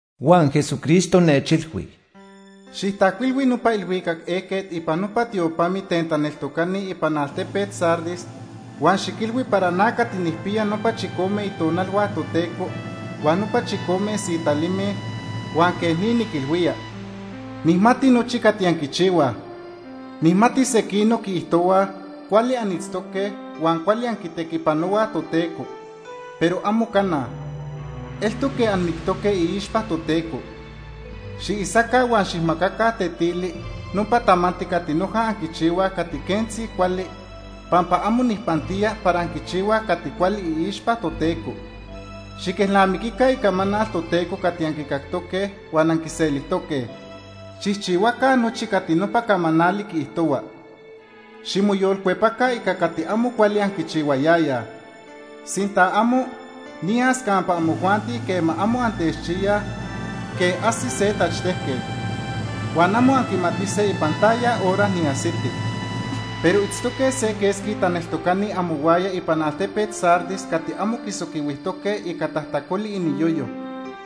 Huan Jesucristo nechilhui: “Xijtajcuilhui nopa ilhuicac ejquet ipan nopa tiopamit ten taneltocani ipan altepet Sardis huan xiquilhui para na cati nijpiya nopa chicome itonalhua Toteco huan nopa chicome sitalime, huan quej ni niquilhuía: “Nijmati nochi cati anquichihuaj. Nijmati sequinoc quiijtohuaj cuali anitztoque huan cuali anquitequipanohuaj Toteco, pero amo cana. Eltoc quej anmictoque iixpa Toteco. Xiisaca huan xijmacaca tetili nopa tamanti cati noja anquichihuaj cati quentzi cuali, pampa amo nijpantía para anquichihuaj cati cuali iixpa Toteco. Xiquelnamiquica icamanal Toteco cati anquicactoque huan anquiselijtoque. Xijchihuaca nochi cati nopa camanali quiijtohua. Ximoyolcuepaca ica cati amo cuali anquichihuayayaj. Sinta amo, niyas campa amojuanti quema amo antechchiyaj quej ajsi se tachtejquet. Huan amo anquimatise ipan taya hora niajsiti. “Pero itztoque se quesqui taneltocani amohuaya ipan altepet Sardis cati amo quisoquihuijtoque ica tajtacoli iniyoyo.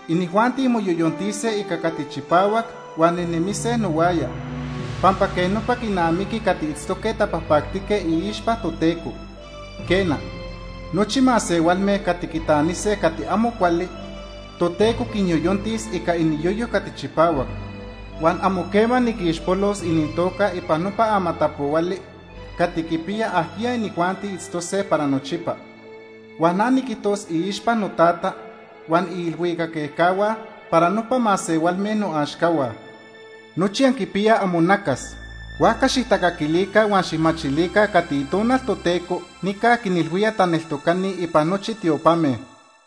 Inijuanti moyoyontise ica cati chipahuac huan nejnemise nohuaya, pampa quej nopa quinamiqui cati itztoque tapajpactique iixpa Toteco. Quena, nochi masehualme cati quitanise cati amo cuali Toteco quinyoyontis ica iniyoyo cati chipahuac. Huan amo quema niquixpolos inintoca ipan nopa amatapohuali cati quipiya ajquiya inijuanti itztose para nochipa. Huan na niquijtos iixpa noTata huan iilhuicac ejcahua para nopa masehualme noaxcahua. Nochi anquipiyaj amonacas, huajca xijtacaquilica huan xijmachilica cati Itonal Toteco nica quinilhuía taneltocani ipan nochi tiopame.”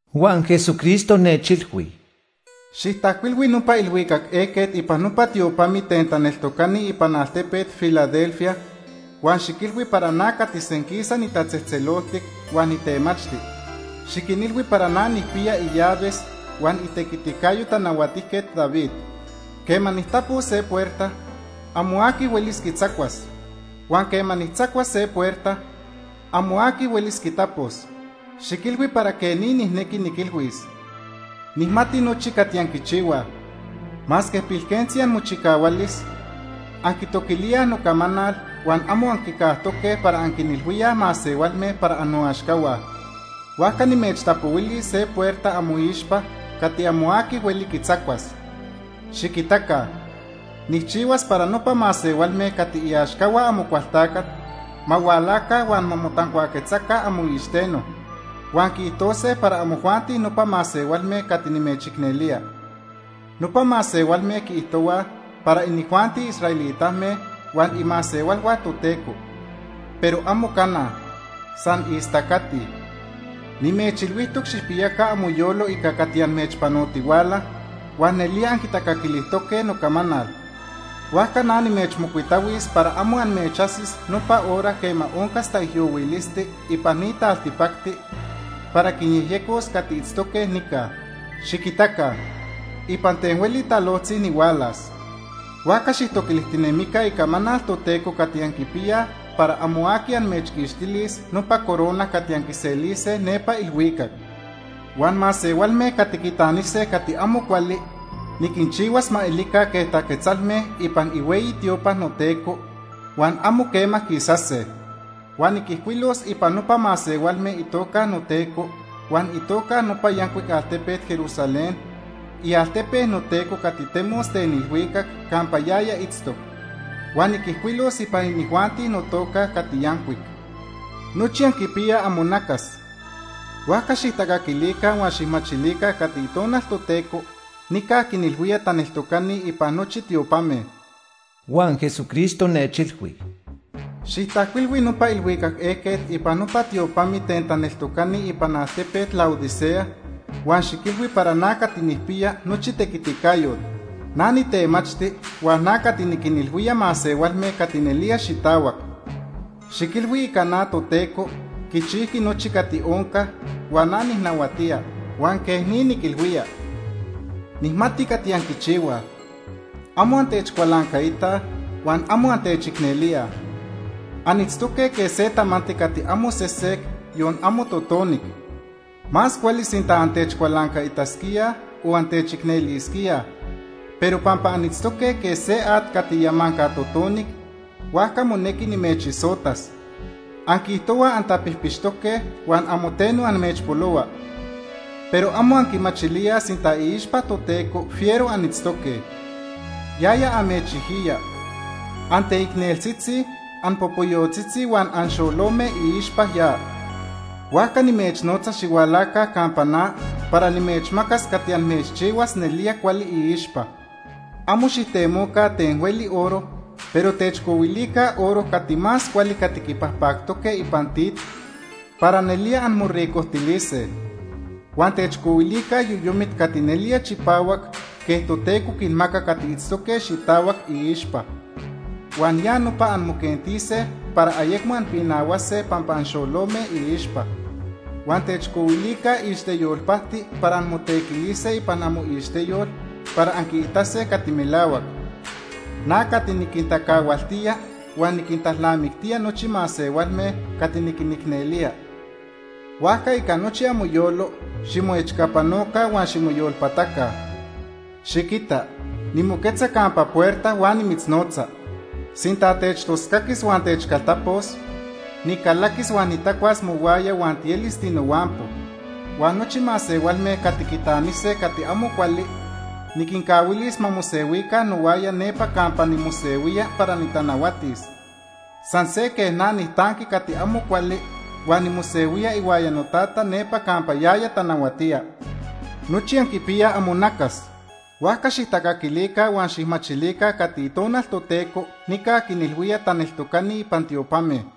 Huan Jesucristo nechilhui: “Xijtajcuilhui nopa ilhuicac ejquet ipan nopa tiopamit ten taneltocani ipan altepet Filadelfia huan xiquilhui para na cati senquisa nitatzejtzeloltic huan nitemachti. Xiquinilhui para na nijpiya illaves huan itequiticayo Tanahuatijquet David. Quema nijtapos se puerta, amo aqui huelis quitzacuas huan quema nijtzacuas se puerta, amo aqui huelis quitapos. Xiquilhui para quej ni nijnequi niquilhuis: “Nijmati nochi cati anquichihuaj. Masque pilquentzi amochicahualis, anquitoquilíaj nocamanal huan amo anquicajtoque para anquinilhuíaj masehualme para annoaxcahua. Huajca nimechtapohuili se puerta amoixpa cati amo aqui hueli quitzacuas. Xiquitaca, nijchihuas para nopa masehualme cati iaxcahua Amocualtacat ma hualaca huan ma motancuaquetzaca amoicxiteno, huan quiijtose para amojuanti nopa masehualme cati nimechicnelía. Nopa masehualme quiijtohuaj para inijuanti israelitame huan imasehualhua Toteco, pero amo cana. San istacatij. “Nimechilhuijtoc xijpiyaca amoyolo ica cati amechpanotihuala, huan nelía anquitacaquilijtoque nocamanal, huajca na nimechmocuitahuis para amo amechajsis nopa hora quema oncas taijyohuilisti ipan ni taltipacti para quinyejyecos cati itztoque nica. Xiquitaca, ipan ten hueli talojtzi nihualas. Huajca xijtoquilijtinemica icamanal Toteco cati anquipiyaj para amo aqui amechquixtilis nopa corona cati anquiselise nepa ilhuicac. Huan masehualme cati quitanise cati amo cuali niquinchihuas ma elica quej taquetzalme ipan ihueyi tiopa noTeco, huan amo quema quisase. Huan niquijcuilos ipan nopa masehualme itoca noTeco huan itoca nopa yancuic altepet Jerusalén, ialtepe noTeco cati temos ten ilhuicac campa yaya itztoc. Huan niquijcuilos ipan inijuanti notoca cati yancuic. Nochi anquipiyaj amonacas, huajca xijtacaquilica huan xijmachilica cati Itonal Toteco nica quinilhuía taneltocani ipan nochi tiopame.” Huan Jesucristo nechilhui: “Xijtajcuilhui nopa ilhuicac ejquet ipan nopa tiopamit ten taneltocani ipan altepet Laodicea huan xiquilhui para na cati nijpiya nochi tequiticayot. Na nitemachti huan na cati niquinilhuía masehualme cati nelía xitahuac. Xiquilhui ica na Toteco quichijqui nochi cati onca huan na nijnahuatía, huan quej ni niquilhuía: “Nijmati cati anquichihuaj. Amo antechcualancaitaj huan amo antechicnelíaj. Anitztoque quej se tamanti cati amo sesec, yon amo totonic. Más cuali sinta antechcualancaitasquíaj o antechicnelisquíaj, pero pampa anitztoque quej se at cati yamanca totonic, huajca monequi nimechisotas. Anquiijtohuaj antapijpixtoque huan amo teno amechpolohua, pero amo anquimachilíaj sinta iixpa Toteco fiero anitztoque. Yaya amechijiya. Anteicneltzitzi, anpopoyotzitzi huan anxolome iixpa ya. Huajca nimechnotza xihualaca campa na para nimechmacas cati amechchihuas nelía cuali iixpa. Amo xijtemoca ten hueli oro, pero techcohuilica oro cati más cuali cati quipajpactoque ipan tit para nelía anmoricojtilise. Huan techcohuilica yoyomit cati nelía chipahuac quej Toteco quinmaca cati itztoque xitahuac iixpa, huan ya nopa anmoquentise para ayecmo anpinahuase pampa anxolome iixpa. Huan techcohuilica ixteyol pajti para anmotequilise ipan amoixteyol para anquiitase cati melahuac. “Na cati niquintacahualtía huan niquintalnamictía nochi masehualme cati niquinicnelía, huajca ica nochi amoyolo ximoechcapanoca huan ximoyolpataca. “Xiquita, nimoquetza campa puerta huan nimitznotza. Sinta techtoscaquis huan techcaltapos, nicalaquis huan nitacuas mohuaya huan tielis tinohuampo. Huan nochi masehualme cati quitanise cati amo cuali niquincahuilis ma mosehuica nohuaya nepa campa nimosehuía para nitanahuatis, san se quej na nijtanqui cati amo cuali huan nimosehuía ihuaya noTata nepa campa yaya tanahuatía. Nochi anquipiyaj amonacas, huajca xijtacaquilica huan xijmachilica cati Itonal Toteco nica quinilhuía taneltocani ipan tiopame.”